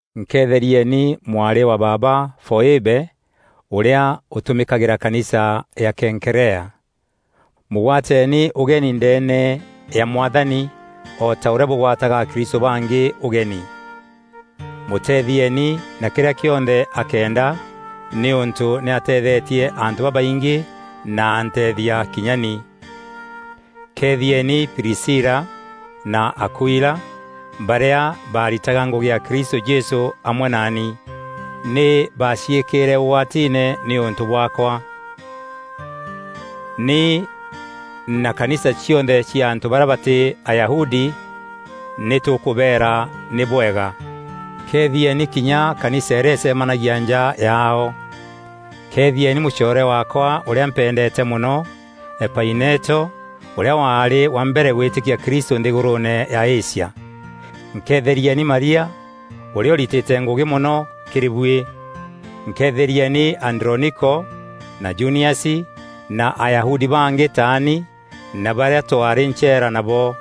Nkeetherieni mwarî wa baaba Foîbe, ûrîa ûtûmîkagîra kanisa ya Kenkerea, Mûgwateeni ûgeni ndeene ya Mwathani o ta ûrîa bûgwataga akristû bangî ûgeni. Mûteethieeni na kîrîa kîonthe akeenda nîûntû nî ateethetie antû babaingî na anteethia kinya ni. Keethieni Prisila na Akuila, barîa baaritaga ngûgî ya Kristû Jesû amwe naani. Nî baaciîkîîre ûgwatiine nîûntû bwaakwa. Ni na kanisa cionthe cia antû barîa batî Ayahudi nî tûkûbeera nî bwega. Keethieni kinya kanisa îrîa îcemanagia nja yaao. Keethieni mûcoore waakwa ûrîa mpendeete mono, Epaineto, ûrîa waarî wa mbere gwîtîkia Kristû nthîgûrûûne ya Asia. Nkeetherieni Maria, ûrîa ûritîte ngûgî mono kîrî buî. Nkeetherieni Androniko na Juniasi, na Ayahudi bangî taani na barîa twaarî ncheera nabo.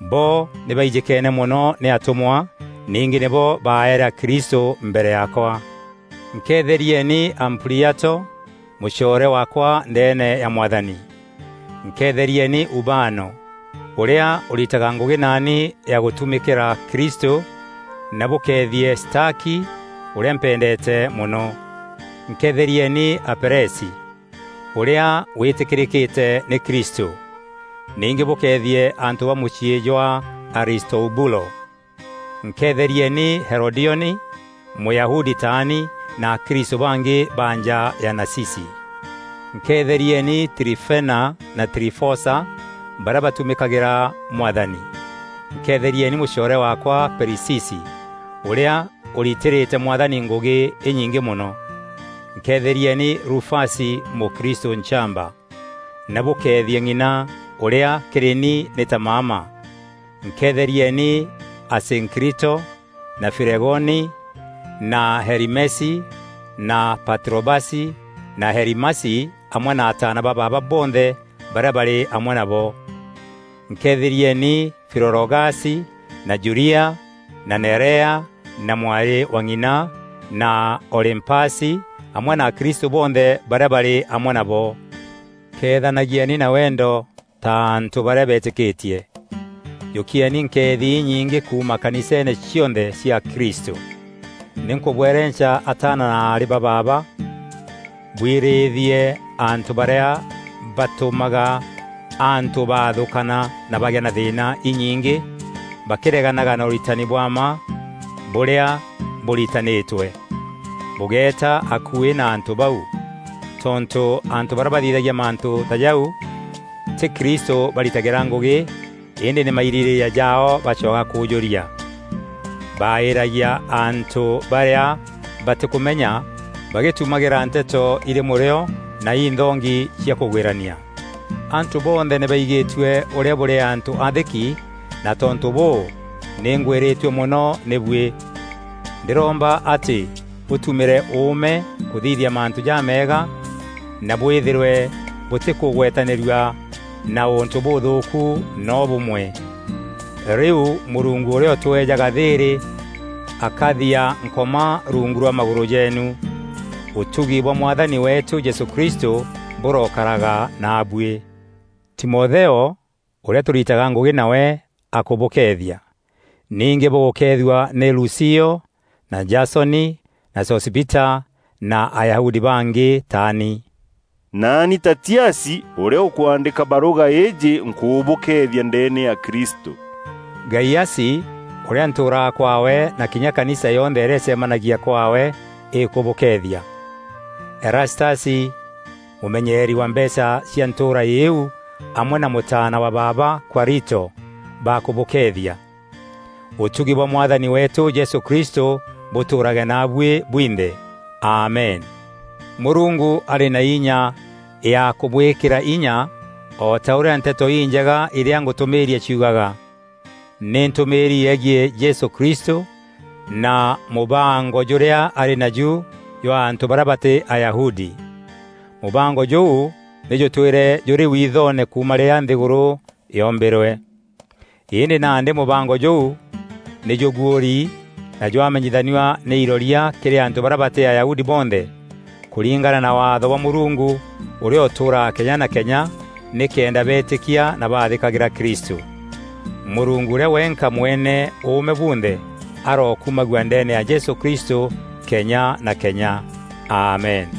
Bo nî baijîkeene mono nî atûmwa, ningî nîbo baeere akristû mbere yaakwa. Nkeetherieni Ampliato, mûcoore waakwa ndeene ya Mwathani. Nkeetherieni Ubano, ûrîa ûrîtaga ngûgî naani ya gûtumîîkîra Kristû na bûkeethie Staki, ûrîa mpendeete mono. Nkeetherieni Apelesi, ûrîa wîtîkîrîkîte nî Kristû. Ningî bûkeethie antû ba mûciî jwa Aristobulo. Nkeetherieni Herodioni, Mûyahudi taani, na akristû bangî ba nja ya Nacici. Nkeetherieni Trifena na Trifosa, barîa batumîkagîra Mwathani. Nkeetherieni mûcoore waakwa Perisisi, ûrîa ûritîrîte Mwathani ngûgî înyingî mono. Nkeetherieni Rufasi mûkristû nchamba, na bûkeethie ng'ina, ûrîa kîrî ni nî ta maama. Nkeetherieni Asînkrito na Flegoni na Herimesi na Patrobasi na Herimasi amwe na ataana ba baaba bonthe barîa barî amwe nabo. Nkeetherieni Filologasi na Julia na Nerea na mwarî wa ng'ina, na Olîmpasi amwe na akristû bonthe barîa barî amwe nabo. Keethanagieni na wendo ta antû barîa beetîkîtie. Jûkieni nkeethi inyîngi kuuma kaniseene cionthe cia Kristû. Nî nkûbwerenca ataana na aarî ba baaba bwirîîthie antû barîa batûmaga antû baathûkana na bagîa na thîîna inyingî, bakîreganaga na ûritani bwa mma bûrîa bûritanîtwe. Bûgéeta akuî na antû bau. Tontû antû barîa bathithagia mantû ta jau tî Kristû baritagîra ngûgî îndî nî mairîrîîria jaao bacwaga kûûjûria. Baaîîragia antû barîa batîkûmenya bagîtumagîra nteto irî mûrîo na inthongi cia kûgwîrania. Antû bonthe nî baigîtue ûrîa bûrî antû aathîki na tontû bûû, nî ngwîrîtue mono nî buî. Ndîromba atî bûtumîre ûûme kûthithia mantû jameega, na bwîthîrwe bûtîkûgwetanîrua na ûntû bûûthûûku noo bûmwe. Rîu Mûrungu ûrîa ûtweejaga thîîrî akathiaa Nkoma rungu rwa magûrû jeenu. Ûtugi bwa Mwathani weetû Jesû Kristû bûrokaraga naabuî. Timotheo, ûrîa tûrîtaga ngûgî nawe akûbûkeethia. Ningî bûgûkeethua nî Lucio, na Jasoni na Sosipita na Ayahudi bangî taani. Naani Tatiasi, ûrîa ûkwandîka barûga îîjî nkûbûkeethia ndeene ya Kristû. Gaiasi, ûrîa ntûûraga kwaawe na kinya kanisa yonthe îrîa îcemanagia kwaawe îkûbûkeethia. Erastasi, mûmenyeeri wa mbeecha cia ntûûra îîu amwe na mûtaana wa baaba, Kwarito bakûbûkeethia. [ Ûtugi bwa Mwathani weetû Jesû Kristû bûtûûrage naabuî bwinthe. Amen.] Mûrungu arî na inya ya kûbwîkîra inya o ta ûrîa Nteto Injega irîa ngûtûmîîria ciugaga. Nî ntûmîîri yegiî Jesû Kristû na mûbango jûrîa arî najû jwa antû barîa batî Ayahudi. Mûbango jûu nî jûtwîre jûrî wiithoone kuuma rîrîa nthîgûrû yoombîrwe. Îndî nandî mûbango jûu nî jûguûri na jwamenyanithua nî iroria kîrî antû barîa batî Ayahudi bonthe, kûringana na Waatho bwa Mûrungu ûrîa ûtûûraga kenya na kenya, nîkenda beetîkia na baathîkagîra Kristû. Mûrungu ûrîa wenka mwene ûûme bunthe, arokumagua ndeene ya Jesû Kristû kenya na Kenya. Amen.